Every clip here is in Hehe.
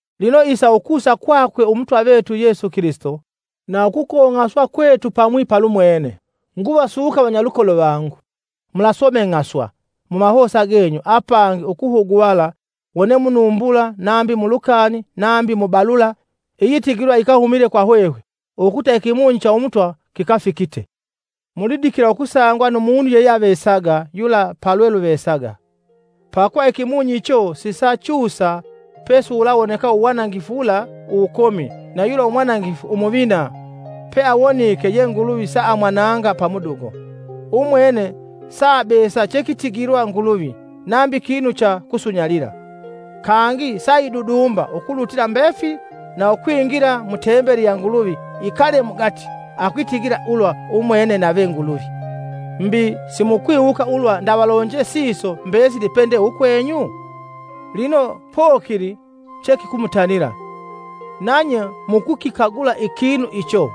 Lino isa ukusa kwakwe Umutwa vetu Yesu Kilisito na ukukong'aswa kwetu pamwi tumwanukila yumwene, nguvasuka vanyalukolo vangu, Mulasomeng'aswa mumahosa genyu apangi ukuhuguvala wone munumbula nambi mu lukani nambi mu balula iyitigilwa yikahumise kwa hwehwe ukuta ikimunyi cha Umutwa kikafikite. Mulidikila ukusangwa nu munu yeyeavesaga yula palweluvesaga. Pakuva ikimunyi icho sisachusa pesiwulawoneka uwanangifu wula uwukomi na yula umwanangifu umuvina peawonike ye Nguluvi saamwananga pamudugo. Umwene saabesa chekitigilwa Nguluvi nambi kinu cha kusunyalila, kangi saidudumba ukulutila mbefili na ukwingila mu Tembeli ya Nguluvi ikale mugati akwitigila ulwa umwene nave Nguluvi. Mbi, simukwiwuka ulwa ndavalonje siso mbesili pende ukwenyu? Lino pokili chekikumutanila, nanye mukukikagula ikinu icho.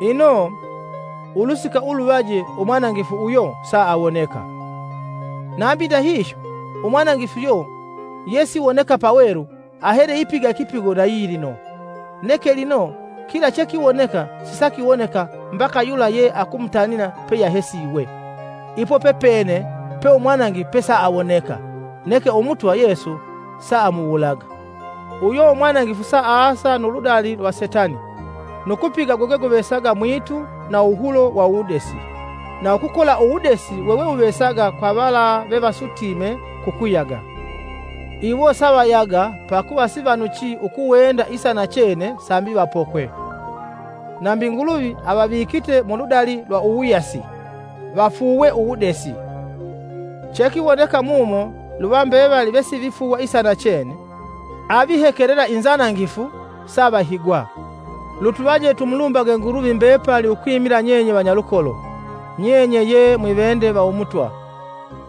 Ino, Ulusika ulumunoje umwanangifu uyo saawoneka. Nambi ndahihyo, umwanangifu uyo yesiwoneka pawelu ahele ipiga ikipigo na yilino, neke lino kila chekiwoneka sisakiwoneka mbaka yula ye akumutanila peyahesiwe. Ipo pepene pe umwanangifu pesaawoneka; neke Umutwa Yesu saamuwulaga. Uyo umwanangifu saasa nu ludali lwa Setani nu kupiga gwegweguvesaga mwitu na uwuhulo wa uwudesi, na ukukola uwudesi wewewuvesaga kwa vala vevasutime ku kuyaga. Iwo savayaga pakuva sivanuchi ukuwenda isa nachene sambi vapokwe. Nambi Nguluvi avavikite mu ludali lwa uwuyasi, vafuuwe uwudesi. Chekiwoneka mumo luva mbevali vesivifuuwa isa nachene, avihekelela inzanangifu, savahigwa. Lutuvaje tumulumbage Nguluvi mbepali ukwimila nyenye vanyalukolo, nyenye ye mwivende va Umutwa,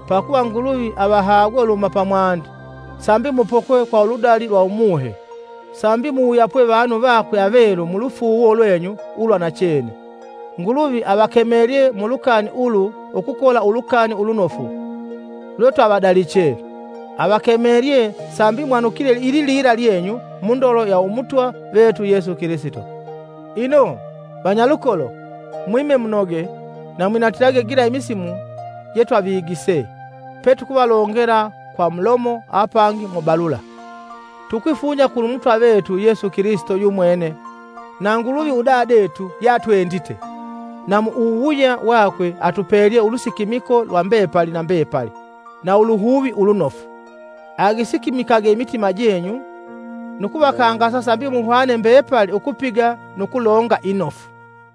pakuva Nguluvi avahagwe uluhuma pamwandi sambi mupokwe kwa uludali lwa Umuhe, sambi muwuyapwe vanu vakwe avelu mulufuuwo lwenyu ulwa nachene. Nguluvi avakemelelye mulukani ulu ukukola Ulukani Ulunofu lwetwavadaliche; avakemelye sambi mwanukile ililila lyenyu mu ndolo ya Umutwa vetu Yesu Kilisito. Ino, vanyalukolo, mwime munoge na mwinatilage sila imisimu gila jetwavigise petukuvalongela kwa mulomo apangi mu balula. Tukwifunya Kulumutwa vetu Yesu Kilisito yumwene na Nguluvi udadetu ye atwendite, na mu uwuwuya wakwe atupelye ulusikimiko lwa mbepali na mbepali na uluhuvi ulunofu, agisikimikage imitima jenyu nu kuvakangasa sambi muhwane mbepali ukupiga nu kulonga inofu.